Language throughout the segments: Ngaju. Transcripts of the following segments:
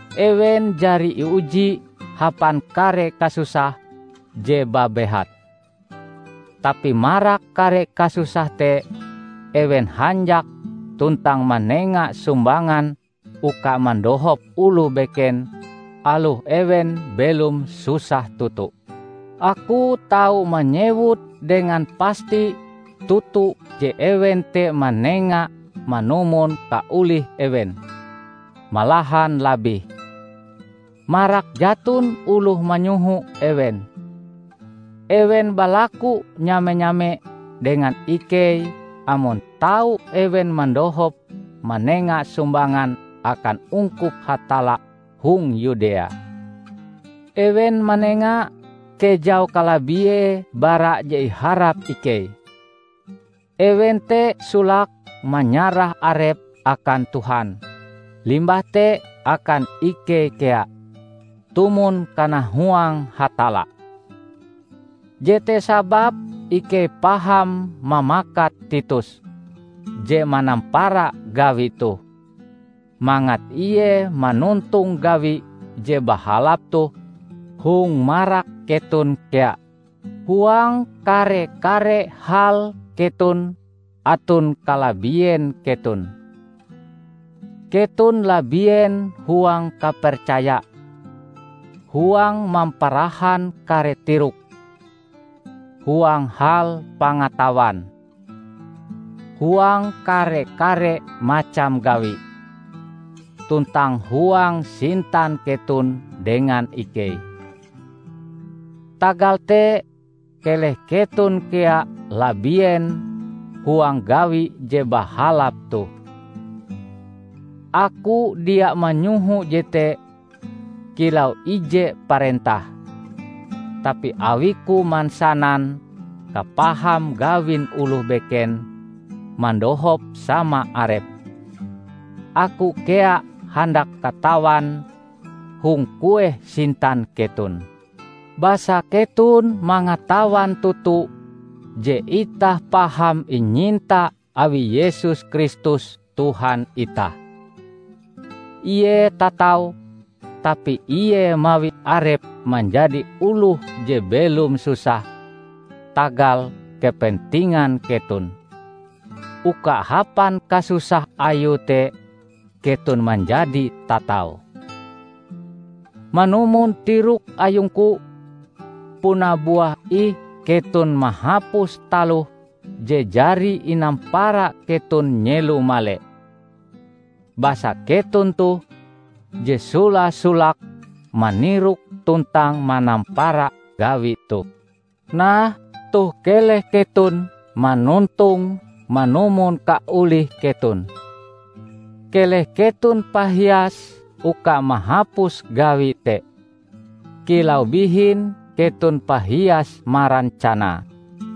Ewen jari iuji hapan kare kasusah je babehat. Tapi marak kare kasusah te, ewen hanjak tuntang manenga sumbangan uka mandohop oloh beken, aloh ewen belom susah toto. Aku tau manyewut dengan pasti toto je ewen te manenga manumon kaolih ewen, malahan labih. Marak jaton oloh manyoho ewen, ewen balaku nyame-nyame dengan ikei amon tau ewen mandohop manenga sumbangan akan ungkup Hatalla hong Yudea. Ewen manenga kejau kalabiee bara je iharap ikei. Ewen te solake manyarah arepe akan Tuhan, limbah te akan ikei kea, tumon kanahuang Hatalla. Jete sababe ikei paham mamakat Titus -- je manampara gawi toh -- mangat ie manontong gawi je bahalap toh hong marak keton kea. Huang kare-kare hal keton aton kalabien keton: keton labien huang kapercaya, huang mamparahan kare tirok, huang hal pangatawan, huang kare-kare macam gawi, tuntang huang sintan keton dengan ikei. Tagal te, keleh keton kea labien huang gawi je bahalap toh. Aku dia manyoho jete kilau ije parentah, tapi awiku mansanan kapaham gawin oloh beken mandohop sama arepe, aku kea handak katawan hong kueh sintan keton. Basa keton mangatawan toto je itah paham inyinta awi Yesus Kristus Tuhan itah. Ie tatau, tapi ie mawi arepe manjadi oloh je belom susah tagal kepentingan keton, uka hapan kasusah Ayue te, keton manjadi tatau. Manumon tirok ayungku, puna buah ih keton mahapus taloh je jari inampara keton nyelo male. Basa keton toh je sola-solake manirok tuntang manampara gawi toh. Nah, toh keleh keton manontonge manumon kaolih keton. Keleh keton pahias uka mahapus gawi te, kilau bihin keton pahias marancanae.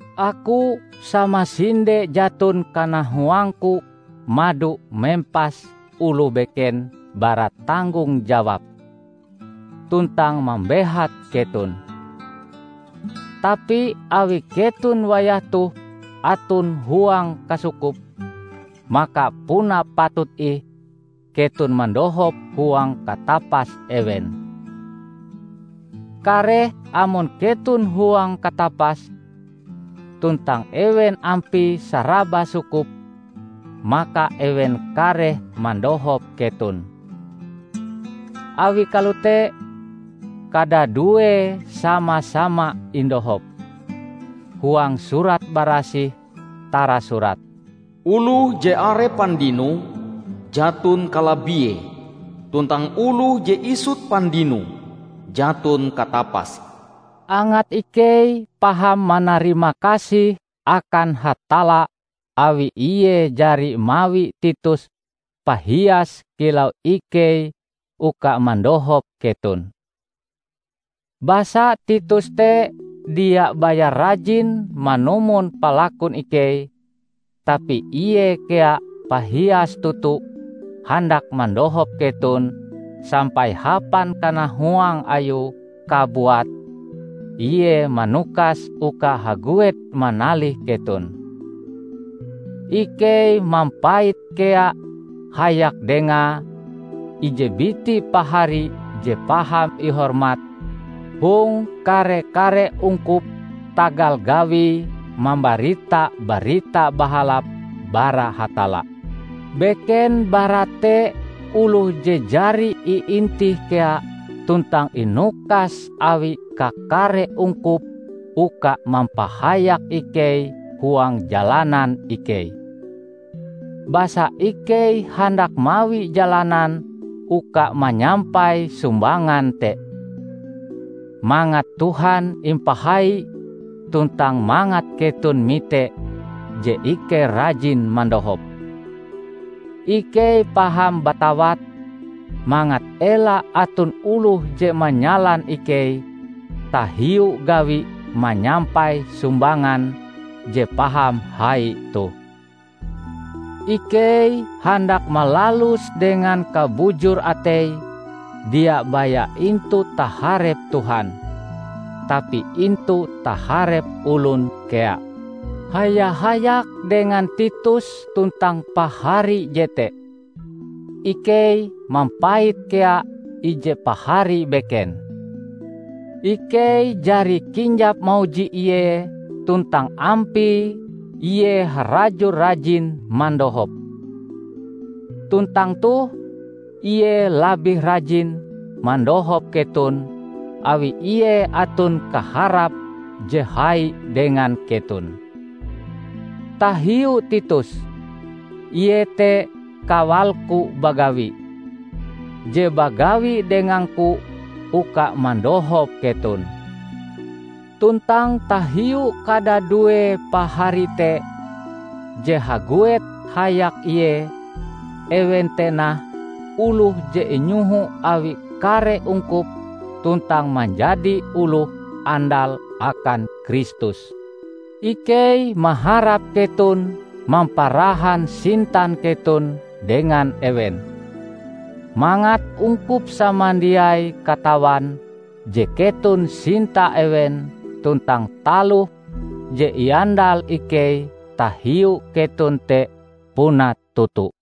Aku samasinde jaton kanahuangku mado mempas oloh beken bara tanggong jawab, tuntang mambehat keton. Tapi awi keton wayah toh aton huang kasukup, maka puna patut ih keton mandohop huang katapas ewen. Kareh amon keton huang katapas, tuntang ewen ampie saraba sukup, maka ewen kareh mandohop keton. Awi kalote, kadaduee sama-sama indohop. Huang Surat Barasih tarasurat, "Oloh je are pandinoe, jaton kalabiee, tuntang oloh je isut pandinoe, jaton katapase." Angat ikei paham manarimakasih akan Hatalla awi ie jari mawi Titus pahias kilau ikei uka mandohop keton! Basa Titus te dia baya rajin manumon palakun ikei, tapi ie kea pahias toto handak mandohop keton sampai hapan kanahuang ayue kabuat ie manukas uka haguet manalih keton. Ikei mampait kea hayak dengae ije biti pahari je paham ihormat hong kare-kare ungkup tagal gawie mambarita Barita Bahalap bara Hatalla. Beken bara te oloh je jari iintih kea tuntang inukas awi kakare ungkup uka mampahayak ikei huang jalanan ikei. Basa ikei handak mawi jalanan uka manyampai sumbangan te, mangat Tuhan impahai tuntang mangat keton mite je ikei rajin mandohop. Ikei paham batawat mangat ela aton oloh je manyalan ikei tahiu gawi manyampai sumbangan je paham hai toh. Ikei handak malaluse dengan kabujur atei dia baya intu taharep Tuhan, tapi intu taharep olon kea. Haya-hayak dengan Titus tuntang pahari jete, ikei mampait kea ije pahari beken. Ikei jari kinjap mauji ie tuntang ampie ie harajur rajin mandohop. Tuntang toh, ie labih rajin mandohop keton awi ie aton kaharape je hai dengan keton. Tahiu Titus, ie te kawalku bagawi, je bagawi dengangku uka mandohop keton. Tuntang tahiu kadadue pahari te, je haguet hayak ie, ewen te nah oloh je inyoho awi kare ungkup tuntang manjadi oloh andal akan Kristus. Ikei maharap keton mamparahan sintan keton dengan ewen, mangat ungkup samandiai katawan je keton sinta ewen tuntang taloh je iandal ikei tahiu keton te puna toto.